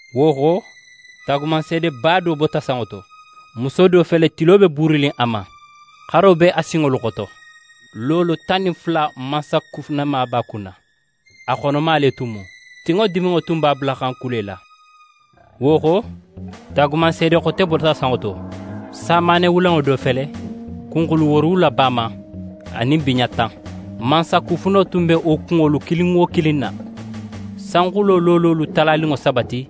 Wo xo, taagumanseedeba do bota sanŋo to: Muso do fele tilo be buurinin a ma, xaro be a sinŋolu xoto, loolo tan nin fula mansakufunema b'a kunna. A xonoma le tun mu, tinŋo diminŋo tun b'a bulaxan kulela. Wo xo, taagumanseede xote bota sanŋo to: Samaane wulenŋo do fele, kunxulu woorowula b'a ma anin biɲa tan. Mansakufuno tun be wo kunŋolu kilin wo kilin na. Sanxulo loololu talaninŋo saba ti,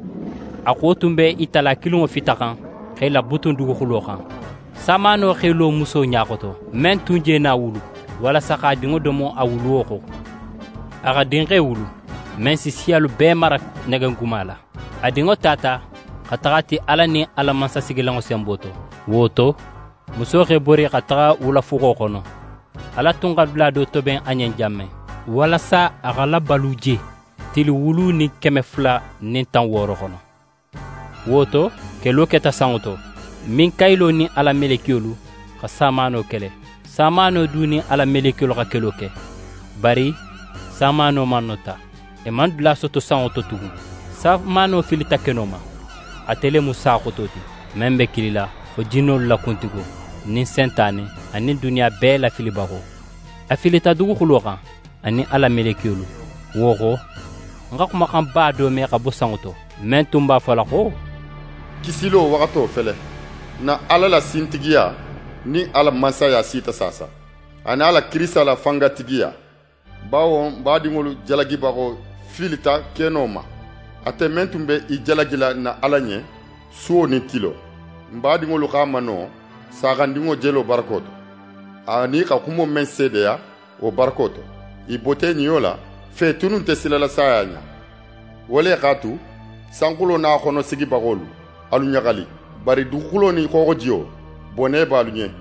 a xuwo tun be i tala kilinŋo fitaxan x'e labutun duguxulo xan. Samaano x'é lo muso ɲa xoto, men tun je na wulu, walasa x'a dinŋo domo a wuluwo xo. A xa dinxe wulu, men si siyalu bee mara negeguma la. A dinŋo tata xa taxa a ti Ala nin a la mansasigilanŋo senbo to. Wo to, muso x'é bori xa taxa wulafuxo xono, Ala tun xa dula do toben a ɲen jan men, walasa a xa labalu je tili wulu nin keme fula nin tan wooro xono. Wo to, kelo keta sanŋo to. Minkayilo nin a la melekiyolu xa samaano kele. Samaano du nin a la melekiyolu xa kelo ke. Bari samaano manota, i man dula soto sanŋo to tugun. Samaano filita keno ma. Ate le mu sa xoto ti, men be kilila xo jinnolu la kuntigo nin Sentane anin duniya bee lafilibaxo. A filita duguxulo xan, a nin a la melekiyolu. Wo xo, ń xa xumaxanba do me xa bo sanŋo to, men tun b'a fola xo: «Kisilo waxato fele! N na Ala la sintigiya nin a la Mansaya sita saasa, anin a la Kirisita la fangatigiya. Bawo n badinŋolu jalagibaxo filita keno ma, ate men tun be i jalagila n na Ala ɲen suwo nin tilo. N badinŋolu x'a mano Saaxandinŋo jelo barako to, anin i xa xumo men seedeya wo barako to. I bota i niyo la fo i tunnu nte silala saya ɲa. Wo le x'a tu, sanxulo nin a xono sigibaxolu, alu ɲaxali! Bari duguxulo nin xooxojiyo, bone be alu ɲen,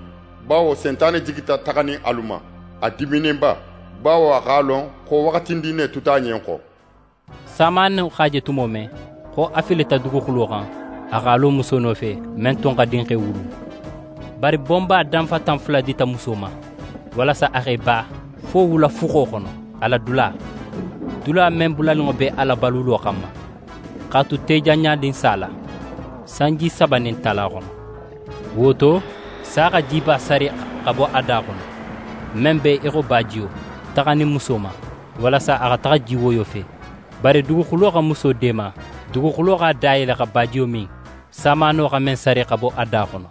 bawo Sentane jigita taxanin alu ma, a diminninba, bawo a x'a lon xo waxatindin ne tuta a ɲen xo.» Samaano x'a je tumo men xo a filita duguxulo xan, a x'a lo muso nofe, men tun xa dinxe wulu. Bari bonba danfatan fula dita muso ma, walasa a x'é ba fo wula fuxo xono, a la dula, dula men bulaninŋo be a labalulo xanma, x'a tu tejanɲanin sa la, sanji saba nin tala xono. Wo to, sa xa jiba sari xa bo a da xono, men be í xo bajiyo, taxanin muso ma, walasa a xa taxa jiwoyo fe. Bari duguxulo xa muso deema: Duguxulo x'a da yele xa bajiyo min, samaano xa men sari xa bo a da xono.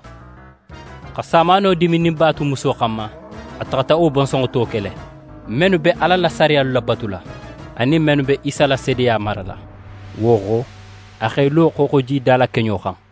Xa samaano diminninba tu muso xanma, a taxata wo bonsonŋo to kele, mennu be Ala la sariyalu labatula, anin mennu be Isa la seedeya marala. Wo xo, a x'é lo xooxojida la keɲo xan.